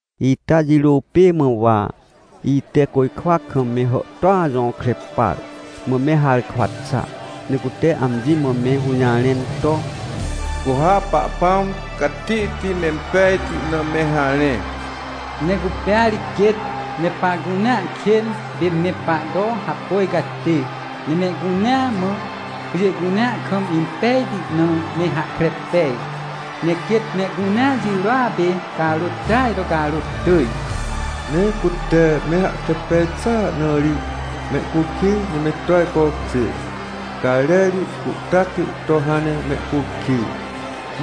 Ita jirô pê mã, wa ite côjkwa kam me hàhtôa jõkre par, mã me harkwa xa, ne cute amji mã me hũjarẽn to: — Cu ha Pahpãm catihti mempejti na me harẽ! Ne cupêa ri quêt me pahcunea kên pê me pahto hapôj catê! Ne mehcunea mã, pjê cunea kam, impejti na me hahkre pej! Ne quêt mehcunea jirôa pê carôt tỳaj to carôt tỳj! Ne cute me hahkre pej xàa na ri mehcukij ne me to ajcokjê, cajrerti cuhtacti to hãn ne mehcukij,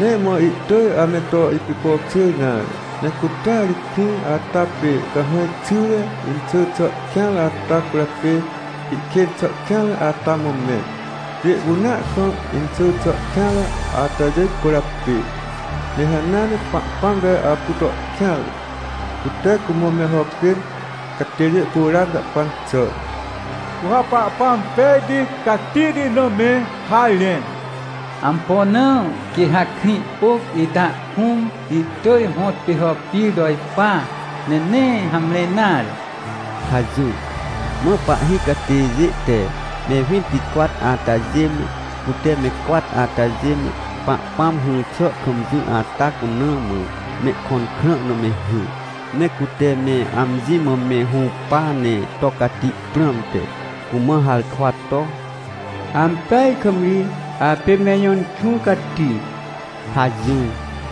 nee mã ihtỳj ame to ipicokjêr nare. Ne cutea ri krĩ ata pê cahãj xyre inxỳ xà kêanre ata cwỳrjapê ihkên xà kêanre ata mã mẽn, pjê cunea kam inxỳ xà kêanre atajê cwỳrjapê. Ne hanea ne Pahpãm te apu to kêanre, cute cumã me hàpên catêjê curan jahpan xà na. — Cu ha Pahpãm pejti catihti na me harẽ. Ampo na? Quê ha krĩ pôc ita kũm ihtỳj hõtpê hàpir to ipa, ne nee hamre nare! — hajỹr. Mã pahhi catêjê te me winticwat atajê me, cute me cwat atajê me, Pahpãm hỹr xà kam jỹ ata cuna mã mehkõn krã na me hỹr, ne cute me amji mã me hũpa ne to cati prãmte, cumã harkwa to: — Ampeaj kam ri! Apê me Ijõ Inxũ Cati! — hajỹr.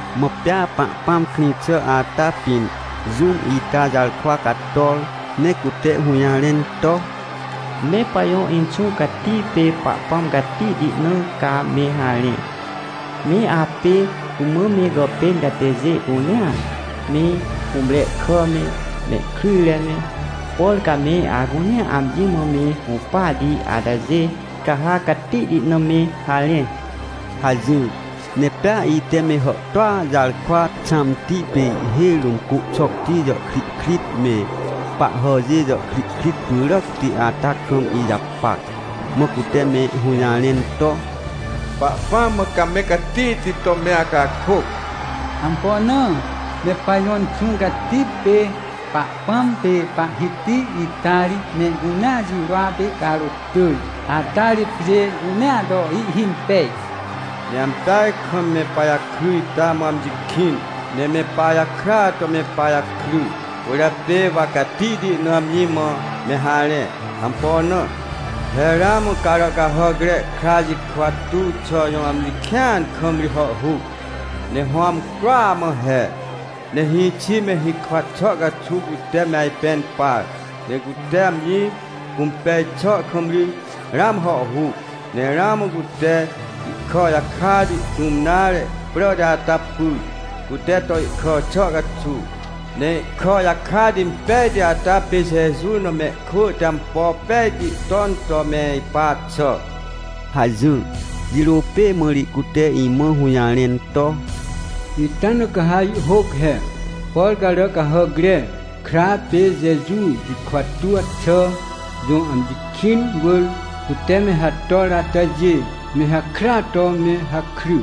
Mã pea Pahpãm krĩ xà ata pĩn jũm ita jarkwa cator, ne cute hũjarẽn to: — Me pajõ Inxũ Cati pê Pahpãm catihti na ca me harẽ! Me apê cumã me gàpên catêjê cunea, me hũmre kà me, mehkryjre me, por ca me acunea amji mã me hũpahti atajê, ca ha catihti na me harẽ! — hajỹr. Ne pea ite me hàhtôa jarkwa xãmti pê ihhêj rũm côhxocti jàhkrihkrit me, pahhàjê jàhkrihkrit pyràcti ata kam ijapac, mã cute me hũjarẽn to: — Pahpãm mã ca me catihti to me acakôc. Ampo na? Me pajõ Inxũ Cati pê Pahpãm pê Pahhiti ita ri mehcunea jirôa pê carôt tỳj, ata ri pjê cunea to ihhimpej. Ne ampeaj kam me pajakry ita mã amji kĩn, ne me pajakrya to me pajakry, cwỳrjapê wa catihti na amji mã me harẽ. Ampo na? He ramã Caràcahàcre Kra jikwa tuw xà jõ amji kĩan kam ri hàhhuc, ne hõ amcroa mã he. Ne hĩxi me hikwa xà caxuw cute me ajpẽn par, ne cute amji cũmpej xàa kam ri ramã hàhhuc. Ne ramã cute ihkà jakati, tũm nare, pràti ata pyr, cute to ihkà xà caxuw, ne ihkà jakati impejti ata pê Jeju na mehkwỳ te ampo pejti ton to me ipa xà — hajỹr. Jirô pê mã ri cute imã hũjarẽn to: — Ita na ca ihhôc he: — “Por Caràcahàcre Kra pê Jeju jikwa tuw xà jõ amji kĩn wỳr cute me hator atajê, me hakrya to me hakry”.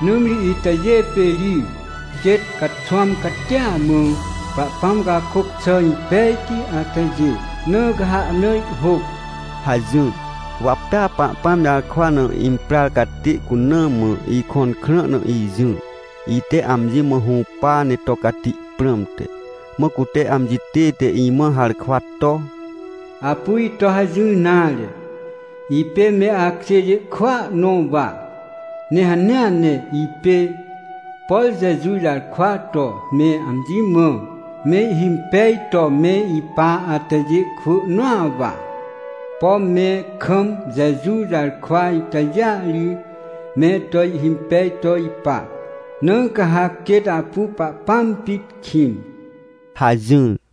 Nãmri itajê pê ri quêt caxwãm catia mã Pahpãm cakôc xà impejti atajê, na ca ha ahna ihhôc — hajỹr. Wa pea Pahpãm jarkwa na imprar catê cuna mã ikõn krã na ijỹr, ite amji mã hũpa ne to cati prãmte, mã cute amji tête imã harkwa to: — Apu ito hajỹr nare, ipê me akjêjê kwỳa nõ wa. Ne hanea ne ipê, por Jeju jarkwa to me amji mã mehhimpej to me ipa atajê kwỳ nõa wa. Pom me kam Jeju jarkwa itajêa ri me to ihhimpej to ipa. Na ca ha quêt apu Pahpãm pit kĩn — hajỹr.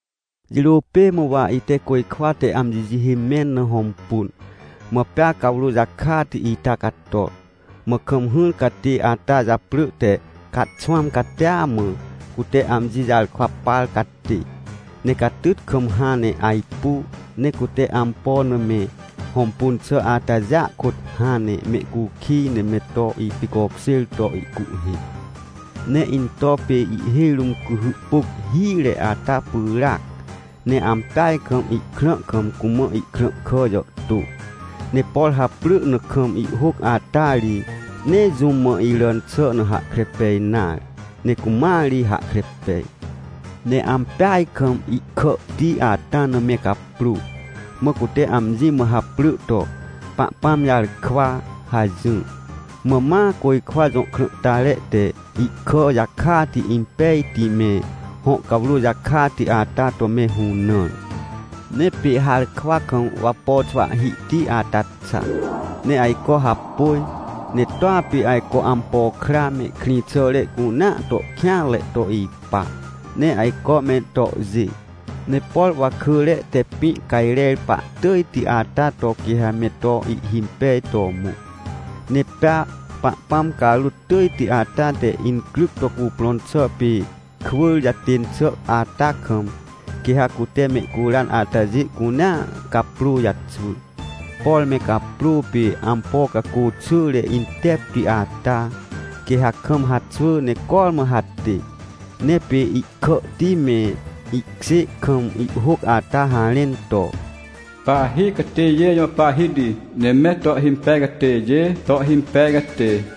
Jirô pê mã, wa ite côjkwa te amji jihê mẽn na hõmpun, mã pea cawrô jakati ita cator. Mã kam hỹr catê ata japrỳ te Caxwãm Catia Mã Cute Amji Jarkwa Par Catê. Ne catyt kam hãn ne ajpu, ne cute ampo na me hõmpun xà atajêa kôt hãn ne mehcukij ne me to ipicokjêr to ihcuhhê. Ne into pê ihhêj rũm cuhy pôc hire ata pyràac, ne ampeaj kam ihkrã kam cumã ihkrãhkà jàhtô. Ne por haprỳ na kam ihhôc ata ri, nee jũm mã iràn xà na hahkre pej nare, ne cumãa ri hahkre pej. Ne ampeaj kam ihkàhti ata na me caprô. Mã cute amji mã haprỳ to: “Pahpãm Jarkwa” hajỹr. Mã ma côjkwa jõ krãhtare te ihkà jakati impejti me, hõ cawrô jakati ata to me hũnãr. Ne pê harkwa kam wapo xwahhihti ata xa, ne ajco hapôj, ne toa pê ajco ampo kra me, krĩxàre cunea to kêanre to ipa, ne ajco me tohjê! Ne por wakỳre te pĩ cajrer pahtỳjti ata to, quê ha me to ihhimpej to mõ. Ne pea Pahpãm carôt tỳjti ata te incryc to cuprõn xà pê kwỳr jatên xà ata kam, quê ha cute mehcuran atajê cunea caprô jaxwỳ. Por me caprô pê ampo cacô xỳre intepti ata, quê ha kam haxwỳ ne cormã hatê. Ne pê ihkàhti me, ihkjê kam ihhôc ata harẽn to: “Pahhi Catêjê Jõ Pahhiti, Ne Me To Ihhimpej Catêjê To Ihhimpej Catê”.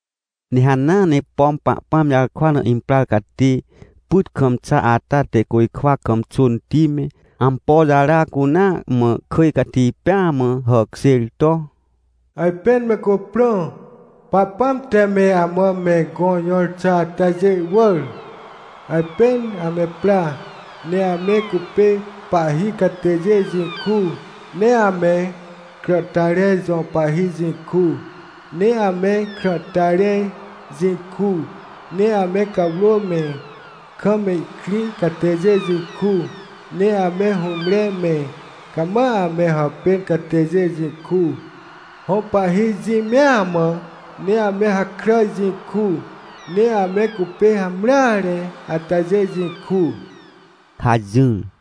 Ne hanea ne, pom Pahpãm jarkwa na imprar catê pyt kam xa ata te côjkwa kam xônti me, ampo jara cunea mã kỳj cati pêa mã hàkjêr to: — Ajpên me cuprõ! Pahpãm te me amã me gõ jõr xà atajê wỳr! Ajpên ame pra, ne ame cupê pahhi catêjê jĩ ku, ne ame krãhtare jõ pahhi jĩ ku, ne ame krãhtare jĩ ku, ne ame cawrô me, kam ihkrĩ catêjê jĩ ku, ne ame hũmre me, cama ame hàpên catêjê jĩ ku, hõ pahhi jĩ mea mã, ne ame hakràj jĩ ku, ne ame cupê hamreare atajê jĩ ku — hajỹr.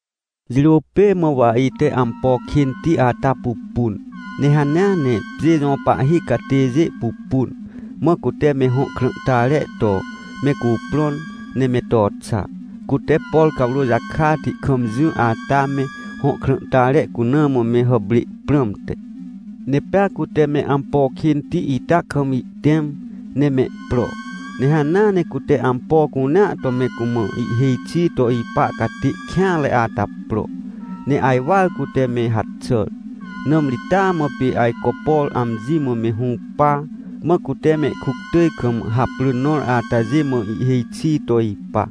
Jirô pê mã, wa ite ampo kênti ata pupun, ne hanea ne pjê jõ pahhi catêjê pupun, mã cute me hõ krãhtare to me cuprõn, ne me to xa, cute, por cawrô jakati kam jỹ ata me hõ krãhtare cuna mã me hàprê prãmte. Ne pea cute me ampo kênti ita kam ihtẽm, ne mehpro, ne hanea ne cute ampo cunea to me cumã ihhêj xi to ipa catê kêanre ata pro, ne ajwar cute me haxàr. Nãmri taa mã pê ajco, por amji mã me hũpa, mã cute me kuctỳj kam haprỳ nõr atajê mã ihhêj xi to ipa.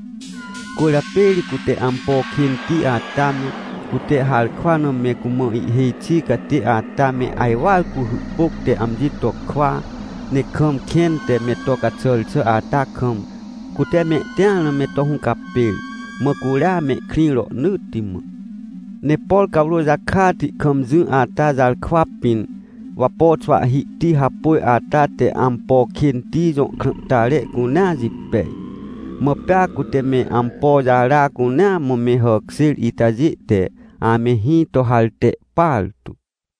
Cwỳrjapê ri cute ampo kênti ata me, cute harkwa na me cumã ihhêj xi catê ata me, ajwar cuhy pôc te amji to kwa, ne kam kẽn te me to caxàr xà ata kam, cute mehtĩar na me to hũcapêr. Mã curia mehkrĩ rohnỳtti mã. Ne por cawrô jakati kam jỹ ata jarkwa pĩn, wapo xwahhihti hapôj ata te ampo kênti jõ krãhtare cunea jipej. Mã pea cute me ampo jara cunea mã me hàkjêr itajê te ame hĩ to harte partu.